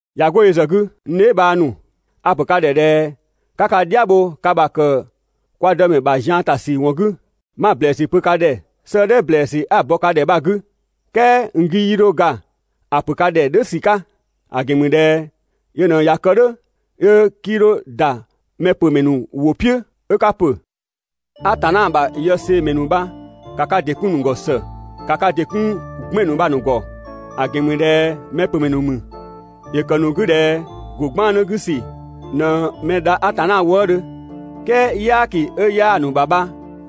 ꞊Ya 'go yö ‑zë 'gü, n dheebhang ‑nu, a‑ ‑pö ka ‑dhɛ ꞊dhɛ 'ka ka "dhia bho ka ‑bha ‑kë kwa Dëmɛ ‑bha zian ‑ta ‑sü ‑wɔn 'gü. 'Ma‑ ‑blɛɛsü pö ka ‑dhɛ 'sëëdhɛ ‑blɛɛsü 'a‑ bɔ ka ‑dhɛ bha‑ 'gü, "kɛɛ n 'gü 'yii 'dho ga ‑a ‑pö ka ‑dhɛ "dhʋ̈ ‑sü 'ka, ‑a ‑gɛn ‑mü ꞊dhɛ yö ꞊në ꞊ya kë "dhʋ̈, 'yö 'kii 'dho ‑da mɛpömɛ ‑nu ‑wʋ "piʋ̈, 'ö 'ka ‑pö. Atanna ‑bha yëseemɛ ‑nu bha ‑ka ka ‑dɩ 'kun‑ ‑nu ‑gɔ ‑së, ‑ka ka ‑dɩ 'kun 'gbɛn‑ ‑nu bha‑ ‑nu ‑gɔ, ‑a ‑gɛn ‑mü ꞊dhɛ mɛpömɛ ‑nu ‑mü. ‑Yö ‑kë ‑nu 'gü ꞊dhɛ ‑go 'gbannë 'gü ‑sü ꞊në mɛ dha Atanna wëëdhö, "kɛɛ "yaaki 'ö 'yaa‑ ‑nu ‑bha bha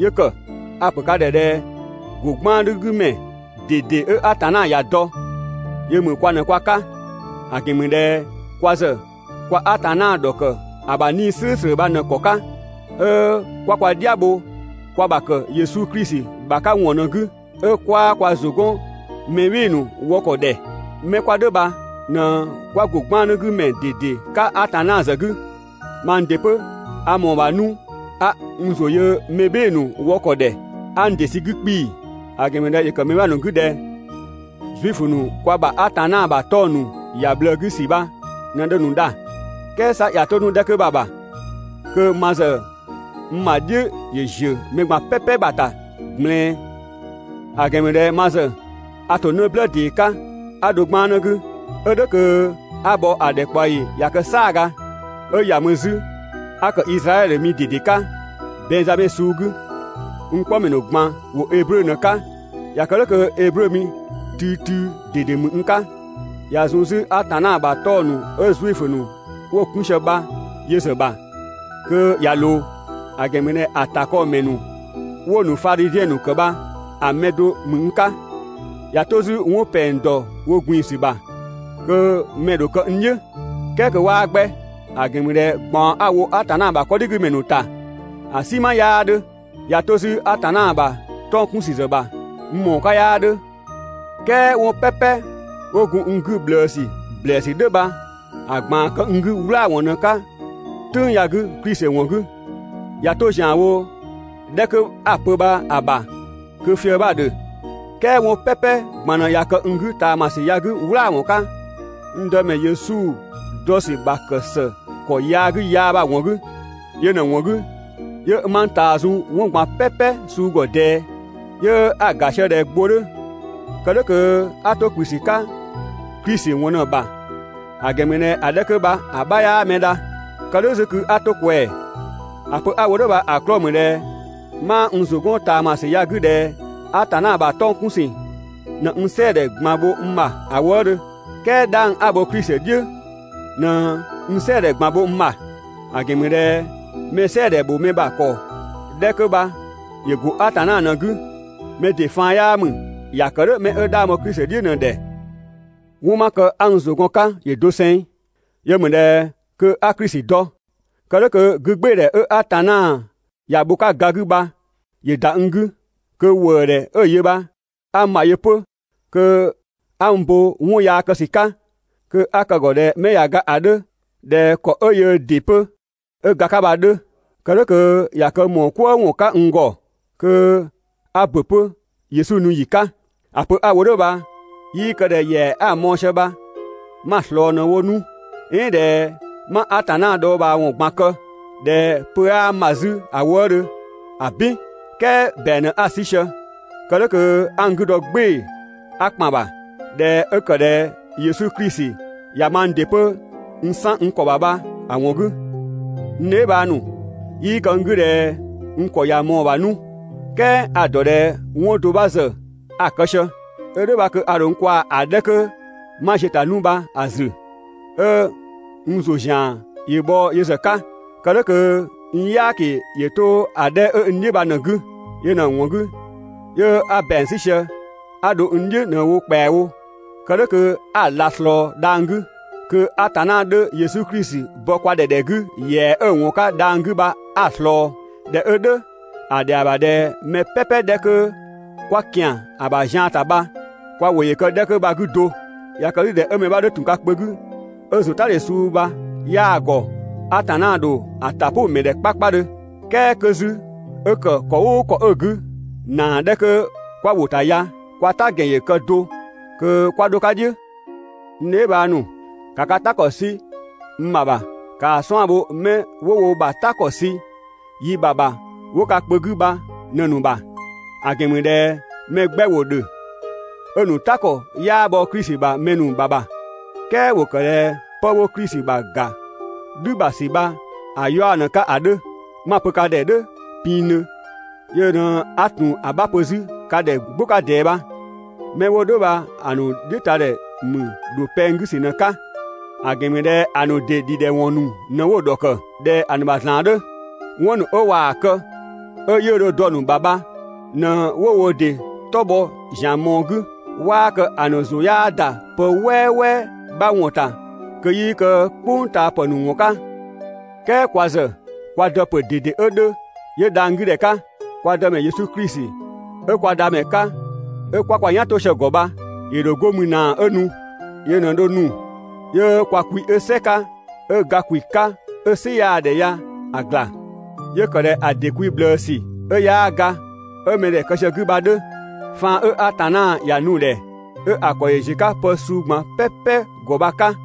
'yö ‑kë. A‑ ‑pö ka ‑dhɛ ꞊dhɛ ‑go 'gbannë 'gü ‑mɛ ꞊dede 'ö Atanna ‑ya dɔ, yö ‑mü kwa ꞊në kwa 'ka, ‑a ‑gɛn ‑mü ꞊dhɛ kwa ‑zë kwa Atanna ‑dhɔkë ‑a ‑bha 'Nii‑ "slʋ̈ʋ̈slʋ̈ bha ꞊në‑ ‑kɔ 'ka, 'ö 'kwa kwa "dhia bho kwa ‑bha ‑kë Yesu Klisi ‑bha 'ka ‑wɔn ꞊në‑ 'gü, 'ö 'kwaa kwa ‑zʋ 'gɔn mɛ "bhɩɩ‑ ‑nu wɔ ‑kɔ ‑dhɛ. 'Mɛ 'kwa "dhʋ̈ bha ꞊në 'kwa ‑go 'gbannë 'gü ‑mɛ ꞊dede 'ka Atanna ‑zë 'gü. Mang ‑dɩ 'pö a ‑mɔɔ ‑bha 'nu 'a n ‑zʋ yö mɛ "bhɩɩ‑ ‑nu wɔ ‑kɔ ‑dhɛ 'a n ‑dɩ sü‑ 'gü 'kpii‑. ‑A ‑gɛn ‑mü ꞊dhɛ ‑yö ‑kë mɛ 'bha ‑nu 'gü ꞊dhɛ Zuifö ‑nu kwa ‑bha Atanna ‑bha 'tɔng‑ ‑nu ‑ya ꞊bhlëë 'gü ‑sü bha ꞊në dho‑ ‑nu dha. "Kɛɛ 'sa ꞊ya 'to 'nu‑ 'dhɛ 'kö bha‑ ‑bha kö ma ‑zë n ‑bha "dhiʋ̈‑ ‑ziö ‑nu ꞊gban "pɛpɛ ‑bha ‑ta ꞊gblɛɛn. ‑A ‑gɛn ‑mü ꞊dhɛ ma ‑zë a ‑to 'në "blë ‑dee 'ka 'a dho 'gbannë 'gü, 'ö "dhʋ̈ kö 'a bhɔ ‑a ‑dhɛkpaɔyi ꞊ya kë "saaga. 'Ö ‑ya mü 'zü 'a ‑kë Izraɛdhö mi ꞊dede 'ka, Bɛnngzamɛ suu 'gü. N 'kpɔmɛ ‑nu ꞊gban ‑wo Eblö ꞊në‑ 'ka, ꞊ya kë "dhʋ̈ kö Eblö mi tüütüü ꞊dede ‑mü n 'ka. ꞊Ya zun 'zü Atanna ‑bha 'tɔng‑ ‑nu 'ö Zuifö ‑nu 'wo‑ 'kun sië bha yö ‑zë ‑bha kö ꞊ya ‑loo, ‑a ‑gɛn ‑mü ꞊dhɛ ‑a ‑takɔɔmɛ ‑nu 'wo‑ ‑nu Fadhiziɛn ‑nu ‑kë bha‑ mɛ do ‑mü n 'ka. ꞊Ya 'to 'zü 'wɔn ‑pɛng ‑dɔ wo ꞊gbin‑ ‑sü ‑bha, kö mɛ‑ ‑dho kë n "dhiʋ̈, "kɛɛ kö 'waa 'gbɛ, ‑a ‑gɛn ‑mü ꞊dhɛ ꞊gbaɔn 'a‑ wo Atanna ‑bha 'kɔdhigümɛ ‑nu ‑ta, ‑a "sinma 'yaa 'dhö. ꞊Ya 'to 'zü Atanna ‑bha 'tɔng‑ 'kun ‑sü ‑zë ‑bha, n ‑mɔɔ 'ka 'yaa 'dhö. "Kɛɛ 'wɔn "pɛpɛ 'wo gun n 'gü ꞊bhlëësü ‑blɛɛsü "dhʋ̈ bha‑ ꞊gbaan kë n 'gü "wlaawɔn ꞊në‑ 'ka "tʋ̈ng ya‑ 'gü Klisi ‑wɔn 'gü. ꞊Ya 'to ‑zian wo‑ 'dhɛ 'kö 'a‑ pö bha‑ ‑bha kö‑ fië‑ 'bha‑ ‑dhö, "kɛɛ 'wɔn "pɛpɛ ꞊gban ꞊në ꞊ya kë n 'gü ꞊taamasü ya‑ 'gü "wlaawɔn 'ka, n Dëmɛ Yesu dɔ ‑sü ‑bha ‑kë ‑së ‑kɔ yaa 'gü yaa bha‑ ‑wɔn 'gü. Yö ꞊në‑ ‑wɔn 'gü 'yö 'ma n ꞊taa zun 'wɔn ꞊gban "pɛpɛ suu ‑gɔ ꞊dɛɛ, 'yö 'a‑ ‑ga sië ꞊dhɛ gbo 'dhö, kë "dhʋ̈ kö 'a 'to ‑kplü ‑sü 'ka Klisi ‑wɔn ꞊në‑ ‑bha (‑a ‑gɛn ‑mü ꞊dhɛ ‑a 'dhɛ 'kö bha 'bha 'yaa mɛ dha). Kë "dhʋ̈ 'zü kö 'a 'to‑ ꞊kwɛɛ‑. ‑A pö 'a‑ wo "dhʋ̈ bha‑ 'klɔɔ‑ ‑mü ꞊dhɛ 'maa n ‑zʋ 'gɔn ꞊taamasü ya‑ 'gü ꞊dhɛ Atanna ‑bha 'tɔng‑ 'kun ‑sü ꞊në n "sɛɛdhɛ ꞊gban bho n ‑bha ‑a wëëdhö, "kɛɛ 'dhang 'a‑ bho Klisi "dhiʋ̈ ꞊në n "sɛɛdhɛ ꞊gban bho n ‑bha, ‑a ‑gɛn ‑mü ꞊dhɛ mɛ "sɛɛdhɛ ‑bho mɛ ‑bha ‑kɔ 'dhɛ kö bha ‑yö ‑go Atanna ꞊në‑ 'gü, mɛ ‑dɩ faan 'yaa ‑mü, ‑ya ‑kë "dhʋ̈ 'mɛ 'ö 'dhang bho Klisi "dhiʋ̈ ꞊në‑ ‑dhɛ. 'Wɔn 'ö 'ma kë 'a n ‑zʋ gɔn‑ 'ka ‑yö doseng. Yö ‑mü ꞊dhɛ kö 'a Klisi dɔ, kë "dhʋ̈ kö 'gügbɩɩdhɛ 'ö Atanna ‑ya bho‑ 'ka ga 'gü bha ‑yö ‑da n 'gü, kö ‑wëëdhɛ 'ö‑ yö bha 'a n ‑bha yö 'pö, kö 'a n bo 'wɔn yaa kë ‑sü 'ka, (kö 'a kë‑ ‑gɔ ꞊dhɛ 'mɛ ꞊ya ga‑ 'dhö ꞊dhɛ ‑kɔ 'ö yöö ‑dɩ 'pö 'ö ga‑ 'ka bha‑ 'dhö). Kë "dhʋ̈ kö ꞊ya kë ‑mɔɔ "kwëë ‑wɔn 'ka n ‑gɔ, kö 'a ‑bö 'pö (Yesu nu ‑yi 'ka). ‑A pö 'a‑ wo "dhʋ̈ bha 'yii kë ꞊dhɛ ‑yɛa 'a‑ mɔɔ‑ sië bha 'ma‑ ꞊slɔɔ ꞊në‑ wo 'nu, "ɛɛn ꞊dhɛ 'ma Atanna dhɔɔbhaawɔn ꞊gban kë, ꞊dhɛ pö 'aa n ‑bha 'zü ‑a wëëdhö, ‑abin! "Kɛɛ ‑bɛang ꞊në 'a‑ 'sü sië, kë "dhʋ̈ kö 'a n 'gü dɔ "gbɩɩ‑ 'a ‑kpan ‑bha, ꞊dhɛ 'ö ‑kë ꞊dhɛ Yesu Klisi ꞊ya mang ‑dɩ 'pö n 'san n ‑kɔ ‑bha bha‑ ‑wɔn 'gü. N dheebhang ‑nu, 'yii kë n 'gü ꞊dhɛ n ‑kɔ ꞊ya ꞊mɔɔ‑ ‑bha 'nu, "kɛɛ a‑ ‑dɔ ꞊dhɛ 'wɔn do 'bha ‑zë a‑ kë sië. 'Ö "dhʋ̈ bha kö a ‑dho n kwaa‑ 'dhɛ 'kö 'ma ziö‑ ‑ta 'nu bha‑ ‑zü, 'ö n ‑zʋ ‑zian ‑yö bhɔ yö ‑zë 'ka, kë "dhʋ̈ kö n "yaaki ‑yö 'to ‑a 'dhɛ 'ö n "dhiʋ̈ bha ꞊në‑ 'gü. Yö ꞊në‑ ‑wɔn 'gü 'yö 'a ‑bɛang 'sü sië 'a dho n "dhiʋ̈ ꞊në‑ wo ‑kpɛawo, kë "dhʋ̈ kö 'a‑ ꞊la ꞊slɔɔ dhang‑ 'gü, kö Atanna 'dhö Yesu Klisi bɔ kwa ‑dhɛ ‑dhɛ 'gü ‑yɛa 'ö‑ ‑wɔn 'ka dhang‑ 'gü bha 'a‑ ꞊slɔɔ. ꞊Dhɛ 'ö "dhʋ̈ ‑a ‑dhɛa ‑bha ꞊dhɛ mɛ "pɛpɛ 'dhɛ 'kö 'kwa ‑kian ‑a ‑bha zian ‑ta bha kwa ‑wʋ ‑yö kë‑ 'dhɛ 'kö bha‑ 'gü do. ꞊Ya kë 'zü ꞊dhɛ mɛ 'bha 'dhö ‑tun ka kpö 'gü 'ö ‑zʋtadhe suu bha 'yaa‑ ‑gɔ, Atanna ‑dho ‑a ‑ta "pʋ‑ ‑mɛ ‑dhɛ 'kpakpadhö. "Kɛɛ kö 'zü 'ö ‑kë ‑kɔ "ʋʋ ‑kɔ 'ö‑ 'gü, ‑naa 'dhɛ 'kö 'kwa ‑wo ‑ta ya, kwa "ta ‑gɛn ‑yö kë do kö 'kwa 'dho‑ 'ka "dhiʋ̈. N dheebhang ‑nu, ‑ka ka "ta ‑kɔ 'sü n ‑bha ‑bha. ‑Kaa 'suan‑ bho 'mɛ 'wo wo ‑bha "ta ‑kɔ sü yi ‑bha ‑bha 'wo ka kpö 'gü bha ꞊në‑ ‑nu ‑bha. ‑A ‑gɛn ‑mü ꞊dhɛ mɛ 'gbɛ ‑wo ‑dhö 'ö‑ ‑nu "ta ‑kɔ 'yaa bhɔ Klisi ‑bha mɛ ‑nu ‑bha ‑bha, "kɛɛ ‑wo ‑kë ꞊dhɛ 'pë 'wo Klisi ‑bha ‑ga "dhü ‑bha ‑sü bha‑ 'yaɔ‑ ꞊në‑ 'ka ‑a 'dhö. 'Ma‑ pö ka ‑dhɛ "dhʋ̈ pinngdhö, yö ꞊në 'a ‑tun 'bha pö 'zü ka ‑dhɛ "gbʋ 'ka ꞊dɛɛ bha. 'Mɛ 'wo "dhʋ̈ bha‑ ‑nu "dhiʋ̈ ta ‑dhɛ ‑mü ‑dho pɛng 'gü ‑sü ꞊në‑ 'ka, ‑a ‑gɛn ‑mü ꞊dhɛ ‑a ‑nu ‑dɩ ‑dhidhɛwɔn ‑nu ꞊në 'wo‑ ‑dhɔkë (꞊dhɛ‑ ‑nu ‑bha ‑zlan 'dhö). 'Wɔn ‑nu 'ö ꞊waa‑ kë 'ö 'yiʋ̈‑ dho dɔ‑ ‑nu ‑bha bha ꞊në 'wo wo ‑dɩ 'tɔ bhɔ ‑zian mɔɔ‑ 'gü. 'Waa kë ‑a ‑nu ‑zʋ 'yaa ‑da pë "wɛwɛ 'bha ‑wɔn ‑ta kö 'yii kë "kpʋngtaapë ‑nu ‑wɔn 'ka. "Kɛɛ kwa ‑zë kwa Dë ‑pö ꞊dede 'ö 'dhö, 'yö dhang‑ 'gü ‑dhɛ 'ka, kwa Dëmɛ Yesu Klisi 'ö kwa Dhamɛ 'ka 'ö 'kwa kwa "yan 'to sië‑ ‑gɔ bha ‑yö ‑dho 'go mü ꞊naa 'ö nu. Yö ꞊në dho nu 'yö kwa kwi 'ö "sɛ 'ka 'ö ga ‑kwi 'ka 'ö "sɩ 'yaa‑ ‑dhɛ ya‑ ‑gla, 'yö‑ ‑kë ꞊dhɛ ‑a ‑dɩ kwi ꞊bhlëësü 'ö 'yaa ga 'ö mɛdhɛ kë sië‑ 'gü bha‑ 'dhö, faan 'ö Atanna ‑ya nu‑ ‑dhɛ 'ö‑ ‑kɔ ‑yö ‑ziö 'ka pë suu ꞊gban "pɛpɛ ‑gɔ bha‑ 'ka.